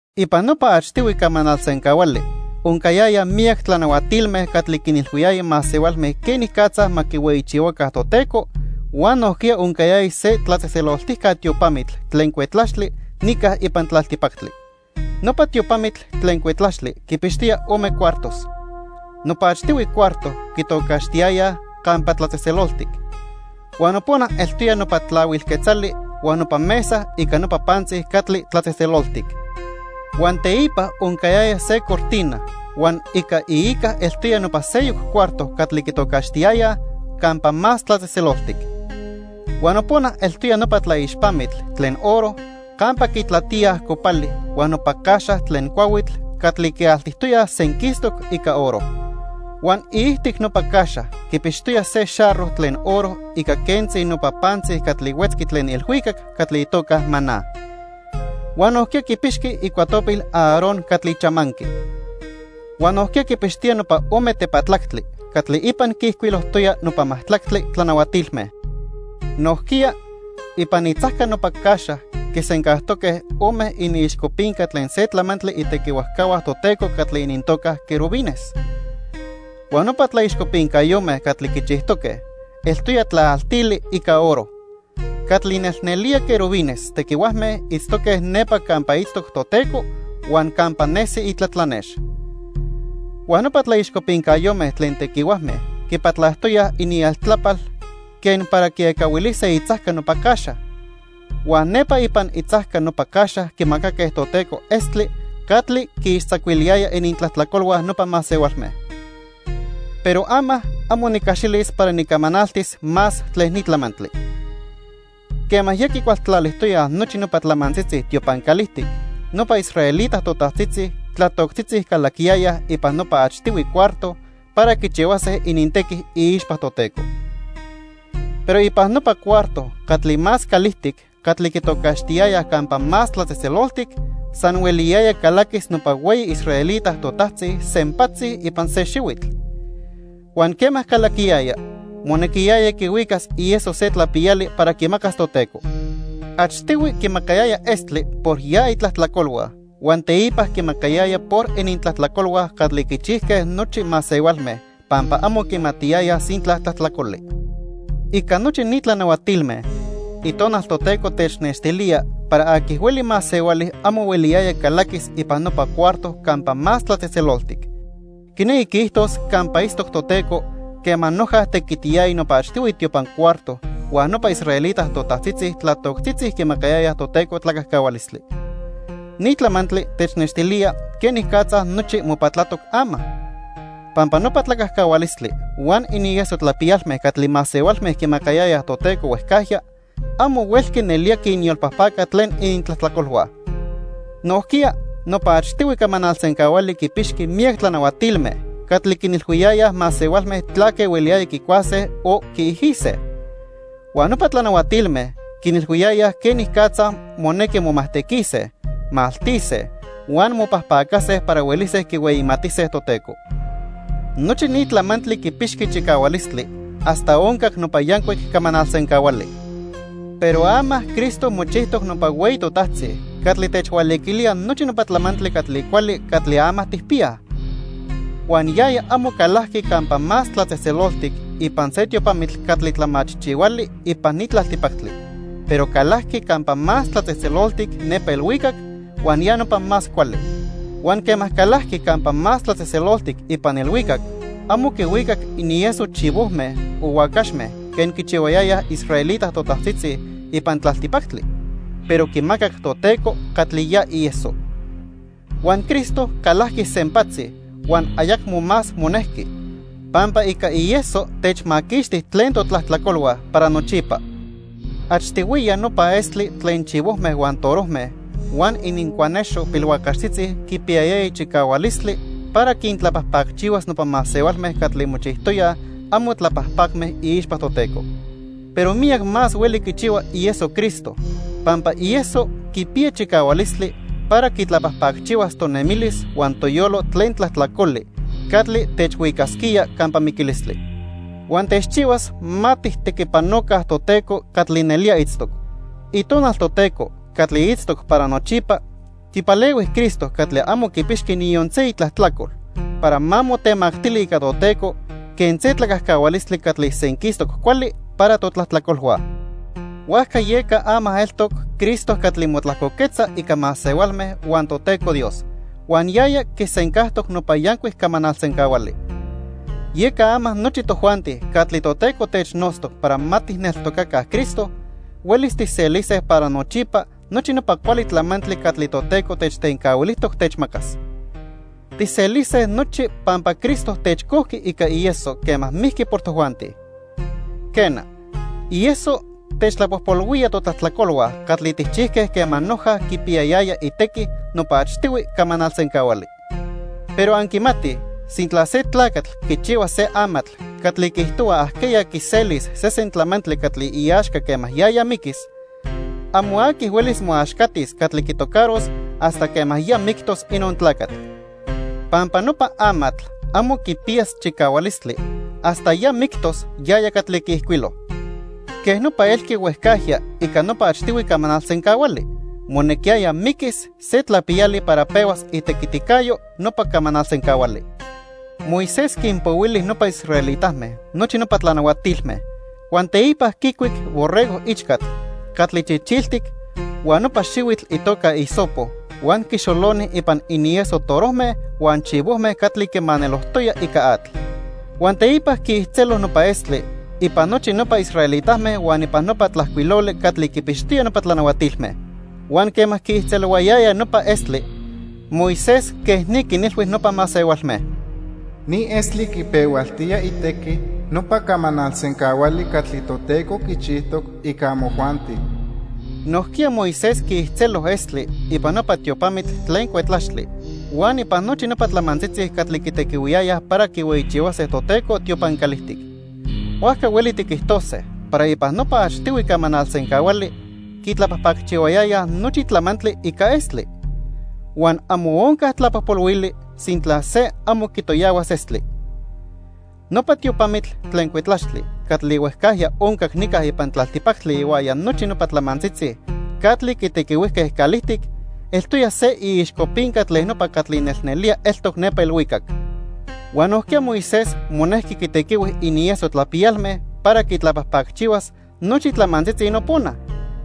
Ipan nopa achtihui camanal sencahuali oncayaya miyac tlanahuatilme catli quinilhuiyaya masehualme quenicatza ma quihueyichihuaca Toteco huan nojquiya oncayaya se tlatzejtzeloltijca tiopamitl tlen cuetlaxtli nica ipan tlaltipactli. Nopa tiopamitl tlen cuetlaxtli quipixtoya ome cuartos. Nopa achtihui cuarto quitocaxtiyayaj "Campa Tlatzejtzeloltic", huan nopona eltoya nopa tlahuil quetzali huan nopa mesa ica nopa pantzi catli tlatzejtzeloltic. Huan teipa oncayaya se cortina huan ica iica eltoya nopa seyoc cuarto catli quitocaxtiyayaj "Campa Más Tlatzejtzeloltic". Huan nopona eltoya nopa tlaixpamitl tlen oro campa quitlatíaj copali huan nopa caxa tlen cuahuitl catli quialtijtoyaj senquistoc ica oro. Huan iijtic nopa caxa quipixtoya se xarro tlen oro ica quentzi nopa pantzi catli huetzqui tlen ilhuicac catli itoca maná. Huan nojquiya quipixqui icuatopil Aarón catli chamanqui. Huan nojquiya quipixtoya nopa ome tepatlactli catli ipan quiijcuilojtoya nopa majtlactli tlanahuatilme. Nojquiya, ipan itzajca nopa caxa quisencajtoque ome iniixcopinca tlen se tlamantli itequihuajcahua Toteco catli inintoca querubines. Huan nopa tlaixcopincayome catli quichijtoque, eltoya tlaaltili ica oro. Catli nelnelía querubines tequihuajme itztoque nepa campa itztoc Toteco huan campa nesi itlatlanex. Huan nopa tlaixcopincayome tlen tequihuajme quipatlajtoyaj inieltlapal quen para quiecahuilise itzajca nopa caxa. Huan nepa ipan itzajca nopa caxa quimacaque Toteco estli catli quiixtzacuiliyaya inintlajtlacolhua nopa masehualme. Pero ama amo nicaxilis para nicamanaltis más tlen ni tlamantli. Quema ya quicualtlalijtoyaj nochi nopa tlamantzitzi tiopan calijtic, nopa israelita totajtzitzi tlatoctzitzi calaquiyayaj ipan nopa achtihui cuarto para quichihuase inintequi iixpa Toteco. Pero ipan nopa cuarto catli más calijtic catli quitocaxtiyayaj Campa Más Tlatzejtzeloltic, san hueliyaya calaquis nopa hueyi israelita totajtzi sempatzi ipan se xihuitl. Huan quema calaquiyaya, monequiyaya quihuicas ieso se tlapiyali para quimacas Toteco. Achtihui quimacayaya estli por ya itlajtlacolhua huan teipa quimacayaya por inintlajtlacolhua catli quichijque nochi masehualme pampa amo quimatiyayaj sintla tlajtlacoli. Ica nochi ni tlanahuatilme, Itonal Toteco technextilía para aqui hueli masehuali amo hueliyaya calaquis ipan nopa cuarto Campa Más Tlatzejtzeloltic, quinequi quiijtos campa itztoc Toteco, quema noja tequitiyaya nopa achtihui tiopan cuarto huan nopa israelita totajtzitzi tlatoctzitzi quimacayayaj Toteco tlacajcahualistli. Ni tlamantli technextilía quenicatza nochi mopatlatoc ama. Pampa nopa tlacajcahualistli huan inieso tlapiyalme catli masehualme quimacayayaj Toteco huejcajya, amo huelqui nelía quinyolpajpaca tlen inintlajtlacolhua. Nojquiya nopa achtihui camanal sencahuali quipixqui miyac tlanahuatilme catli quinilhuiyayaj masehualme tlaque hueliyaya quicuase o quiijise. Huan nopa tlanahuatilme quinilhuiyayaj quenicatza monequi momajtequise, maltise huan mopajpacase para huelise quihueyimatise Toteco. Nochi ni tlamantli quipixqui chicahualistli hasta oncac nopa yancuic camanal sencahuali. Pero ama Cristo mochijtoc nopa Hueyi Totajtzi catli techhualiquilía nochi nopa tlamantli catli cuali catli ama tijpiyaj. Huan yaya amo calajqui Campa Más Tlatzejtzeloltic ipan se tiopamitl catli tlamachijchihuali ipan ni tlaltipactli, pero calajqui Campa Más Tlatzejtzeloltic nepa ilhuicac huan ya nopa más cuali. Huan quema calajqui Campa Más Tlatzejtzeloltic ipan ilhuicac amo quihuicac inieso chivojme o huacaxme quen quichihuayayaj israelita totajtzitzi ipan tlaltipactli, pero quimacac Toteco catli ya ieso. Huan Cristo calajqui sempatzi huan ayacmo más monejqui, pampa ica ieso techmaquixti tlen totlajtlacolhua para nochipa. Achtihuiya nopa estli tlen chivojme huan torojme, huan inincuanexo pilhuacaxtzitzi quipiyayaya chicahualistli para quintlapajpacchihuas nopa masehualme catli mochijtoyaj amo tlapajpacme iixpa Toteco. Pero miyac más hueli quichihua ieso Cristo, pampa ieso quipiya chicahualistli para quitlapajpacchihuas tonemilis huan toyolo tlen tlajtlacoli catli techhuicasquía campa miquilistli. Huan techchihuas ma tijtequipanoca Toteco catli nelía itztoc. Itonal Toteco catli itztoc para nochipa quipalehui Cristo catli amo quipixqui niyon se itlajtlacol, para ma motemactili ica Toteco quen se tlacajcahualistli catli senquistoc cuali para totlajtlacolhua. Huajca yeca ama eltoc Cristo catli motlajcoquetza ica masehualme huan Toteco Dios, huan yaya quisencajtoc nopa yancuic camanal sencahuali. Yeca ama nochi tojuanti catli Toteco technotztoc para ma tijneltocaca Cristo, huelis tijselise para nochipa nochi nopa cuali tlamantli catli Toteco techtencahuilijtoc techmacas. Tijselise nochi pampa Cristo techcojqui ica ieso quema mijqui por tojuanti. Quena, ieso techtlapojpolhuía totlajtlacolhua catli tijchijque quema noja quipiyayaya itequi nopa achtihui camanal sencahuali. Pero anquimatij sintla se tlacatl quichihua se amatl catli quiijtohua ajqueya quiselis sesen tlamantli catli iaxca quema yaya miquis, amo aqui huelis moaxcatis catli quitocaros hasta quema ya mictos inon tlacatl. Pampa nopa amatl amo quipiyas chicahualistli hasta ya mictos yaya catli quiijcuilo. Quej nopa elqui huejcajya ica nopa achtihui camanal sencahuali, monequiyaya miquis se tlapiyali para pehuas itequiticayo nopa camanal sencahuali. Moisés quinpohuili nopa israelitame nochi nopa tlanahuatilme. Huan teipa quicuic borrego ichcatl catli chichiltic huan nopa xihuitl itoca hisopo huan quixoloni ipan inieso torojme huan chivojme catli quimanelojtoya ica atl. Huan teipa quiijtzelo nopa estli ipan nochi nopa israelitame huan ipan nopa tlajcuiloli catli quipixtoya nopa tlanahuatilme. Huan quema quiijtzelohuayaya nopa estli, Moisés quej ni quinilhui nopa masehualme: "Ni estli quipehualtía itequi nopa camanal sencahuali catli Toteco quichijtoc ica amojuanti." Nojquiya Moisés quiijtzelo estli ipan nopa tiopamitl tlen cuetlaxtli huan ipan nochi nopa tlamantzitzi catli quitequihuiyayaj para quihueyichihuase Toteco tiopan calijtic. Huajca hueli tiquijtose para ipan nopa achtihui camanal sencahuali, quitlapajpacchihuayayaj nochi tlamantli ica estli. Huan amo onca tlapojpolhuili sintla se amo quitoyahuas estli. Nopa tiopamitl tlen cuetlaxtli catli huejcajya oncac nica ipan tlaltipactli ihuaya nochi nopa tlamantzitzi catli quitequihuijque calijtic eltoya se iixcopinca tlen nopa catli nelnelía eltoc nepa ilhuicac. Huan nojquiya Moisés monejqui quitequihui inieso tlapiyalme para quitlapajpacchihuas nochi tlamantzitzi nopona,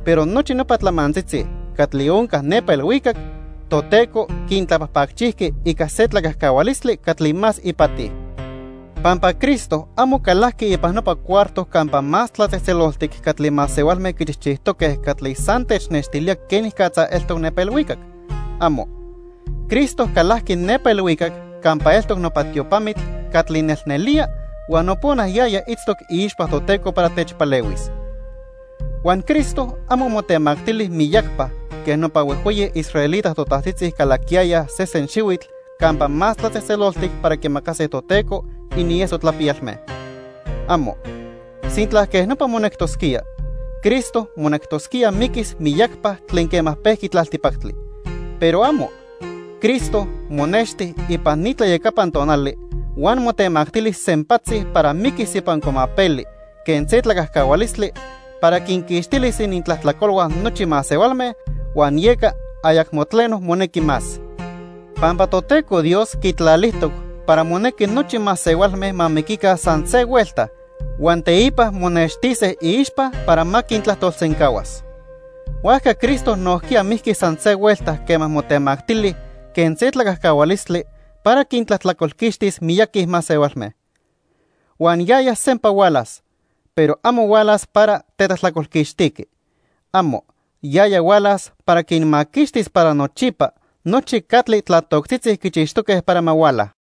pero nochi nopa tlamantzitzi catli onca nepa ilhuicac, Toteco quintlapajpacchijqui ica se tlacajcahualistli catli más ipati. Pampa Cristo amo calajqui ipan nopa cuarto Campa Más Tlatzejtzeloltic catli masehualme quichijchijtoque catli san technextilía quenicatza eltoc nepa ilhuicac. ¡Amo! Cristo calajqui nepa ilhuicac campa eltoc nopa tiopamitl catli nelnelía huan nopona yaya itztoc iixpa Toteco para techpalehuis. Huan Cristo amo motemactili miyacpa quen nopa huejhueyi israelita totajtzitzi calaquiyayaj sesen xihuitl Campa Más Tlatzejtzeloltic para quimacase Toteco inieso tlapiyalme. ¡Amo! Sintla quej nopa monectosquía, Cristo monectosquía miquis miyacpa tlen quema pejqui tlaltipactli. ¡Pero amo! Cristo monexti ipan ni tlayacapan tonali huan motemactili sempatzi para miquis ipan cuamapeli quen se tlacajcahualistli para quinquixtilis inintlajtlacolhua nochi masehualme huan yeca ayacmo tleno monequi más. Pampa Toteco Dios quitlalijtoc para monequi nochi masehualme ma miquica san se huelta huan teipa monextise iixpa para ma quintlajtolsencahuas. Huajca Cristo nojquiya mijqui san se huelta quema motemactili quen se tlacajcahualistli para quintlajtlacolquixtis miyaqui masehualme. Huan yaya sempa hualas, pero amo hualas para tetlajtlacolquixtiqui. ¡Amo! Yaya hualas para quinmaquixtis para nochipa nochi catli tlatoctzitzi quichixtoque para ma huala.